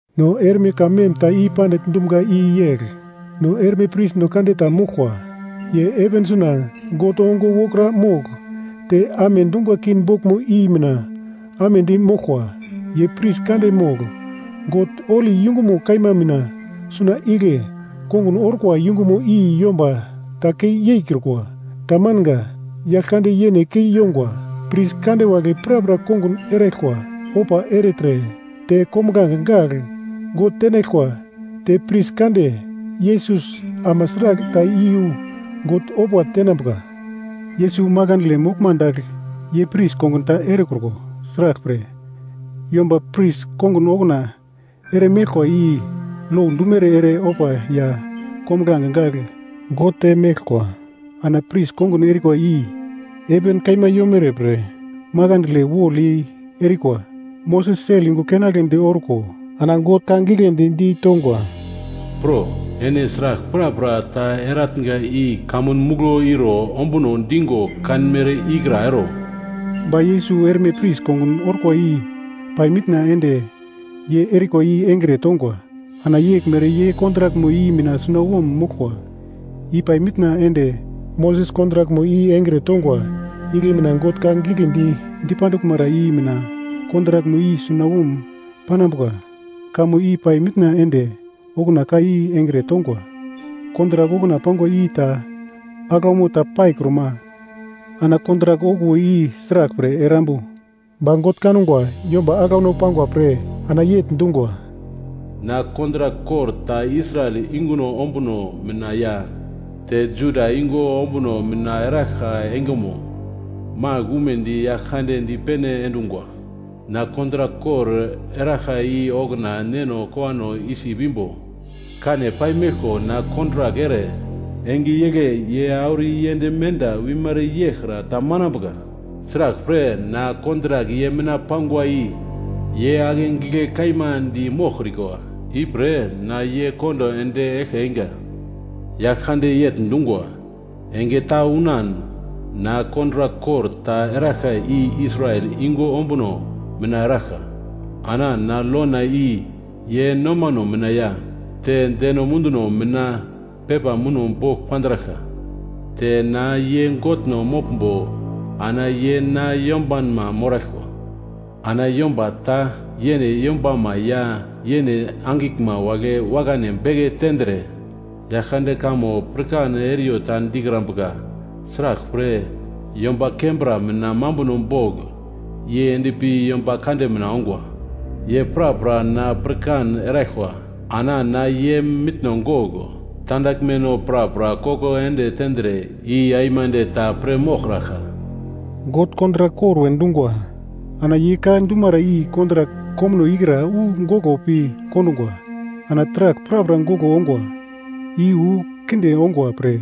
No erme ka mem ta i pandigl dumga i yegl: No erme prisno kande ta moglkwa, ye heven suna God ongo wokra mogl te amedungwa king boglmo i mina amedi moglkwa. Ye pris kande mogl God holi yungumo kaima mina suna igle, kongun orkwa yungumo i yomba ta kei yeikrukwa, tamanga, Yaglkande yene kei yongwa. Pris kande wagle prapra kongun eraglkwa, ofa ertre te kombuglange gagl God tenaglkwa, te pris kande Yesus ama sragl ta iyu God ofa tenambuka. Yesus makandle moglma dagl ye pris kongun ta erekruko, sraglpre, yomba pris kongun okuna ere meglkwa i lo dumere ere ofa ya kombuglange gagl God te meglkwa. Ana pris kongun erikwa i heven kaima yomere pre makandle wolyei erikwa. Moses sel yungu keinagledi orko ana God ka giglendi ditongwa, “Pro, ene sragl prapra ta eratnga i kamun muglo iro ombuno digo kanmere ikra ero.” Ba Yesus erme pris kongun orkwa i pai mitna ende ye erikwa i engre tongwa, ana yeglmere ye kontrakmo i mina sunawom moglkwa, i pai mitna ende Moses kontrakmo i engre tongwa igle mina God ka giglendi dipanduglmara i mina kontrakmo i sunawom panambuka, kamo i pai mitna ende okuna ka i engre tongwa. Kontrak okuna pangwa i ta aglaumo ta paikruma, ana kontrak okuwo i sraglpre erambu. Ba God kangwa yomba aglauno pangwa pre ana yegl dungwa: “Na kontrak kor ta Israel yunguno ombuno mina ya te Juda yungu ombuno mina eraglka engemo magl umedi Yaglkande dipene endungwa. Na kontrak kor eraglka i okuna neno kowano Isip imbo kane paimeglko na kontrak ere, enge igle ye auro yend menda wimere yeglkra tamanambuka. Sraglpre, na kontrak ye mina pangwa i ye ake gigle kaima di moglkrikwa, ipre na ye kondo ende eglke einga. Yaglkande yegl dungwa, Enge ta unan na kontrak kor ta eraglka i Israel yungu ombuno mina eraglka, ana na lona i ye nomano mina ya te deno munduno mina pepa muno bogl pandraglka, te na ye Godno moglmbo ana ye na yombanma moraglkwa. Ana yomba ta yene yombama ya yene angiglma wagle wakane beke tendre, Yaglkande kamo pirkan eriyo ta dikrambuka, sraglpre, yomba kembra mina mambuno bogl yei endpi yomba kande mina ongwa. Ye prapra na pirkan eraglkwa. Ana na ye mitno gogl tandaglmeno prapra koko ende tendre i aimande ta pir moglkraglka.” God kontrak kor we dungwa. Ana ye ka dumara i kontrak komuno ikra wu goglo pi kondungwa, ana taragl prapra goglo ongwa, i wu kinde ongwa pre,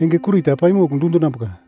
enge kurita paimogl dundinambuka.